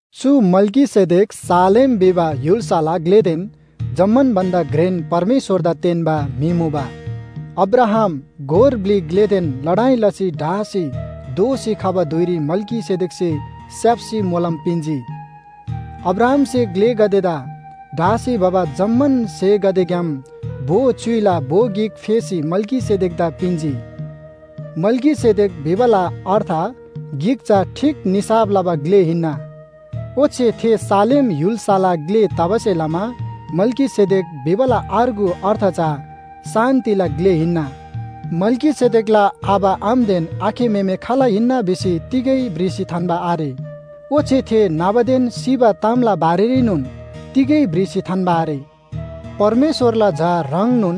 चु मल्‍कीसेदेक शालेम भिबा य्‍हुल्‍साला ग्‍लेदेन जम्‍मान भन्‍दा घ्रेन परमेश्‍वरदा तेन्‍बा म्‍हि मुबा। अब्राहाम गोर ब्‍लि ग्‍लेदेन लडाइ लसी ढासी दोःसी खबा धुइरी मल्‍कीसेदेकसे स्‍याप्‍सी मोलम पिन्‍जी। अब्राहामसे ग्‍लेगदेदा ढासी भबा जम्‍मान स्‍हेगदेग्‍याम भो च्‍युइला भो गिक फेसी मल्‍कीसेदेकदा पिन्‍जी। मल्‍कीसेदेक भिबाला अर्थ गिक चा ठीक निसाफ लबा ग्‍ले हिन्‍ना। ओच्‍छे थे शालेम य्‍हुल्‍साला ग्‍ले तबासे लमा मल्‍कीसेदेक भिबाला अर्गु अर्थ चा शान्‍तिला ग्‍ले हिन्‍ना। मल्‍कीसेदेकला आबा आमादेन आखे म्‍हेमे खाल हिन्‍ना भिसी तिगै भ्रिसी थान्‍बा आरे। ओच्‍छे थे न्‍हबादेन सिबा तामला बारेरीनोन तिगै भ्रिसी थान्‍बा आरे। परमेश्‍वरला झा ह्रङ्नोन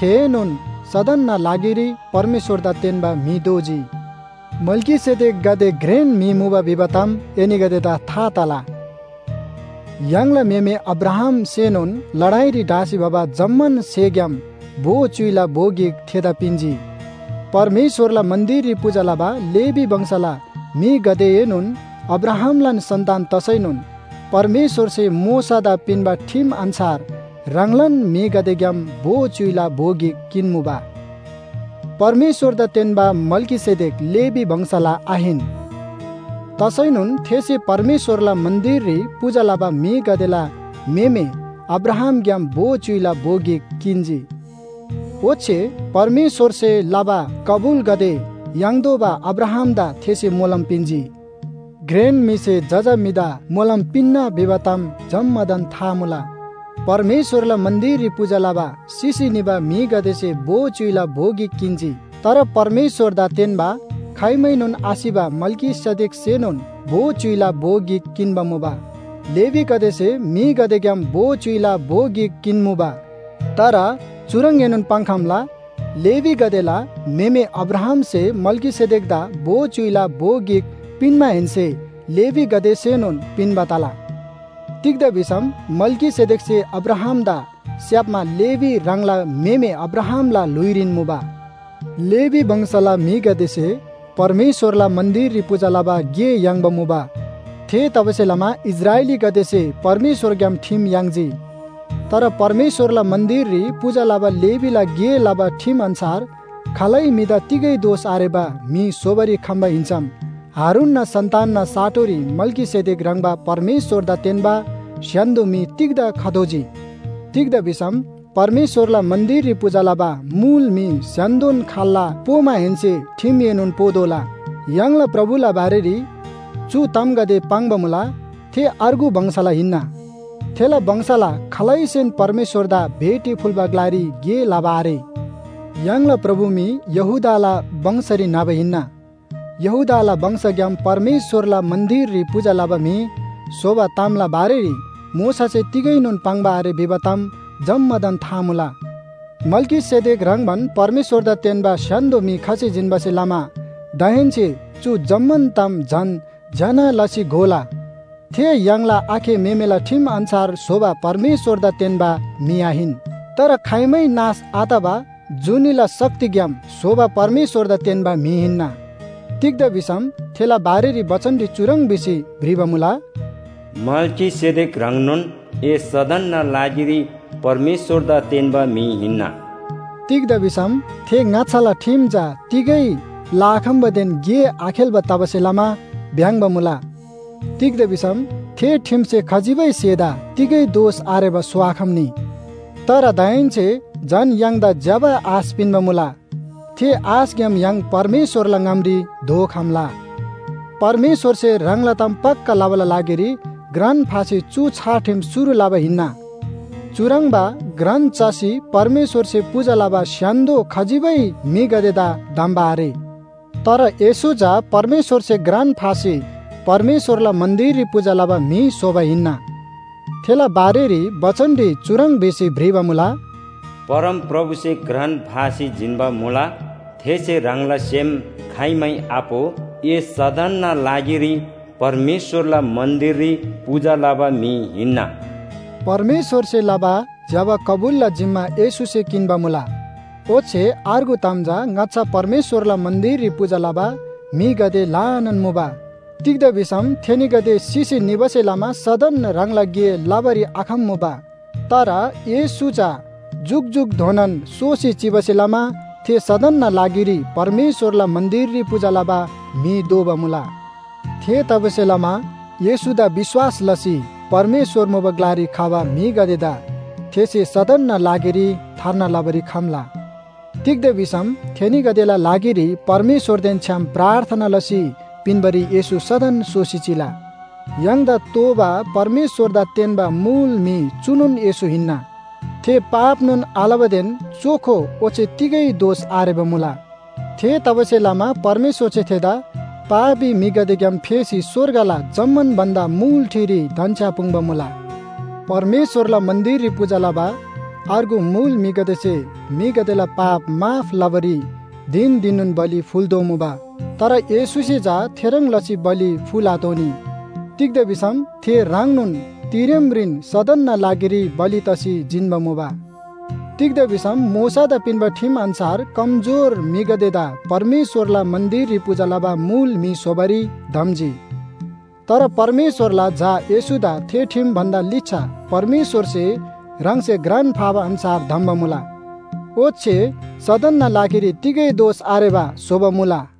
थेएनोन सदनना लागिरी परमेश्‍वरदा तेन्‍बा म्‍हि दोजी। मल्‍कीसेदेक गाते घ्रेन म्‍हि मुबा भिबा ताम एनीगदेदा था तला। य्‍हाङला म्‍हेमे अब्राहामसेनोन लडाइरी ढासी भबा जम्‍मान स्‍हेग्‍याम भो च्‍युइला भो गिक थेदा पिन्‍जी। परमेश्‍वरला मन्‍दिररी पूजा लबा लेवी वंशला म्‍हिगदेएनोन अब्राहामलान सन्‍तान तसैनोन परमेश्‍वरसे मोशादा पिन्‍बा ठिम अन्‍छार ह्राङलान म्‍हिगदेग्‍याम भो च्‍युइला भो गिक किन्‍मुबा। परमेश्‍वरदा तेन्‍बा मल्‍कीसेदेक लेवी वंशला आहिन। तसैनोन थेसे परमेश्‍वरला मन्‍दिररी पूजा लबा म्‍हिगदेला म्‍हेमे अब्राहामग्‍याम भो च्‍युइला भो गिक किन्‍जी। ओच्‍छे परमेश्‍वरसे लबा कबुलगदे याङ्तोःबा अब्राहामदा थेसे मोलम पिन्‍जी। घ्रेन म्‍हिसे जजा म्‍हिदा मोलम पिन्‍ना भिबा ताम जम्‍मादान था मुला। परमेश्‍वरला मन्‍दिररी पूजा लबा सिसी निबा म्‍हिगदेसे भो च्‍युइला भो गिक किन्‍जी। तर परमेश्‍वरदा तेन्‍बा खाइमैनोन आसिबा मल्‍कीसेदेकसेनोन भो च्‍युइला भो गिक किन्‍बा मुबा। लेवीगदेसे म्‍हिगदेग्‍याम भो च्‍युइला भो गिक किन्‍मुबा। तर चुह्रङ्‌एनोन पाङ्‌खम्‍ला, लेवीगदेला म्‍हेमे अब्राहामसे मल्‍कीसेदेकदा भो च्‍युइला भो गिक पिन्‍माहेन्‍से लेवीगदेसेनोन पिन्‍बा तला। तिग्‍दा भिसम मल्‍कीसेदेकसे अब्राहामदा स्‍याप्‍मा लेवी ह्राङला म्‍हेमे अब्राहामला ल्‍हुइरीन मुबा। लेवी वंशला म्‍हिगदेसे परमेश्‍वरला मन्‍दिररी पूजा लबा गे याङ्बा मुबा। थेतबासेलमा इस्राएलीगदेसे परमेश्‍वरग्‍याम ठिम याङ्जी। तर परमेश्‍वरला मन्‍दिररी पूजा लबा लेवीला गे लबा ठिम अन्‍छार खालै म्‍हिदा तिगै दोष आरेबा म्‍हि स्‍होबारी खम्‍बा हिन्‍सम हारूनना सन्‍तानना साटोरी मल्‍कीसेदेक ह्रङ्‌बा परमेश्‍वरदा तेन्‍बा स्‍य्‍हान्‍दो म्‍हि तिग्‍दा खतोःजी? तिग्‍दा भिसम परमेश्‍वरला मन्‍दिररी पूजा लबा मुल म्‍हि स्‍य्‍हान्‍दोन खाल्‍ला पोमाहेन्‍से ठिमएनोन पोतोःला। य्‍हाङला प्रभुला बारेरी चु तामगदे पाङ्बा मुला, थे अर्गु वंशला हिन्‍ना। थेला वंशला खालैसेन परमेश्‍वरदा भेटी फुल्‍बा ग्‍लारी गे लबा आरे। य्‍हाङला प्रभु मी यहूदाला वंशरी न्‍हबा हिन्‍ना। यहूदाला वंशग्‍याम परमेश्‍वरला मन्‍दिररी पूजा लबा म्‍हि स्‍होबा तामला बारेरी मोशासे तिगैनोन पाङ्बा आरे भिबा ताम जम्‍मादान था मुला। मल्‍कीसेदेक ह्रङ्‌बान परमेश्‍वरदा तेन्‍बा स्‍य्‍हान्‍दो म्‍हि खसी जिन्‍बासे लमा दाहेन्‍से चु जम्‍मान ताम झन ज्‍यना लसी घोला। थे य्‍हाङला आखे म्‍हेमेला ठिम अन्‍छार स्‍होबा परमेश्‍वरदा तेन्‍बा म्‍हि आहिन। तर खाइमै नाश आतबा जुनीला शक्तिग्‍याम स्‍होबा परमेश्‍वरदा तेन्‍बा म्‍हि हिन्‍ना। तिग्‍दा भिसम थेला बारेरी बचनरी चुह्रङ् भिसी भ्रिबा मुला, “मल्‍कीसेदेक ह्रङ्नोन ए सदनना लागिरी परमेश्‍वरदा तेन्‍बा म्‍हि हिन्‍ना।” तिग्‍दा भिसम थे ङाच्‍छाला ठिम चा तिगै लआखम्‍बादेन गे आखेल्‍बा तबासे लमा भ्‍याङ्‍बा मुला। तिग्‍दा भिसम थे ठिमसे खजिबै स्‍हेदा तिगै दोष आरेबा स्‍होआखम्‍नी। तर दाहेन्‍से झन य्‍हाङदा ज्‍यबा आश पिन्‍बा मुला। थे आशग्‍याम य्‍हाङ परमेश्‍वरला ङामरी धोखम्‍ला। परमेश्‍वरसे ह्राङला ताम पक्‍का लबाला लागिरी घ्रान फासी चु छार ठिम शुरु लबा हिन्‍ना। चुह्रङ्बा घ्रान चसी परमेश्‍वरसे पूजा लबा स्‍य्‍हान्‍दो खजिबै म्‍हिगदेदा धम्‍बा आरे, तर येशू चा परमेश्‍वरसे घ्रान फासी परमेश्‍वरला मन्‍दिररी पूजा लबा म्‍हि स्‍होबा हिन्‍ना। थेला बारेरी बचनरी चुह्रङ् भिसी भ्रिबा मुला, “परमप्रभुसे घ्रान फासी जिन्‍बा मुला, थेसे ह्राङला सेम खाइमै आपो। ‘ए सदनना लागिरी परमेश्‍वरला मन्‍दिररी पूजा लबा म्‍हि हिन्‍ना।’” परमेश्‍वरसे लबा ज्‍यबा कबुलला जिम्‍मा येशूसे किन्‍बा मुला। ओच्‍छे अर्गु ताम चा ङाच्‍छा परमेश्‍वरला मन्‍दिररी पूजा लबा म्‍हिगदे ल्‍हानान मुबा। तिग्‍दा भिसम थेनीगदे सिसी निबासे लमा सदन ह्राङला गे लबारी आखम्‍मुबा। तर येशू चा जुकजुकधोनान सोसी चिबासे लमा थे सदनना लागिरी परमेश्‍वरला मन्‍दिररी पूजा लबा म्‍हि दोबा मुला। थेतबासेलमा येशूदा विश्‍वास लसी परमेश्‍वर मुबा ग्‍लारी खबा म्‍हिगदेदा थेसे सदनना लागिरी थार्ना लबारी खम्‍ला। तिग्‍दा भिसम थेनीगदेला लागिरी परमेश्‍वरदेन छ्‌याम प्रार्थना लसी पिन्‍बारी येशू सदन सोसी चिला। य्‍हाङदा तोःबा परमेश्‍वरदा तेन्‍बा मुल म्‍हि चुनोन येशू हिन्‍ना। थे पापनोन आलबादेन चोखो ओच्‍छे तिगै दोष आरेबा मुला। थेतबासेलमा परमेश्‍वरसे थेदा पापी म्‍हिगदेग्‍याम फेसी स्‍वर्गला जम्‍मान भन्‍दा मुल ठिरी धन्‍छ्‌यापुङ्‌बा मुला। परमेश्‍वरला मन्‍दिररी पूजा लबा अर्गु मुल म्‍हिगदेसे म्‍हिगदेला पाप माफ लबारी धिन धिननोन बलि फुल्‍तोःमुबा। तर येशूसे चा थेह्रङ् लसी बलि फुल्‍आतोःनी। तिग्‍दा भिसम थे ह्राङनोन तिरेमरीन सदनना लागिरी बलि तसी जिन्‍बा मुला। तिग्‍दा भिसम मोशादा पिन्‍बा ठिम अन्‍छार कमजोर म्‍हिगदेदा परमेश्‍वरला मन्‍दिररी पूजा लबा मुल म्‍हि स्‍होबारी धम्‍जी। तर परमेश्‍वरला झा येशूदा थे ठिम भन्‍दा लिच्‍छा परमेश्‍वरसे ह्राङसे घ्रान फाबा अन्‍छार धम्‍बा मुला। ओच्‍छे सदनना लागिरी तिगै दोष आरेबा स्‍होबा मुला।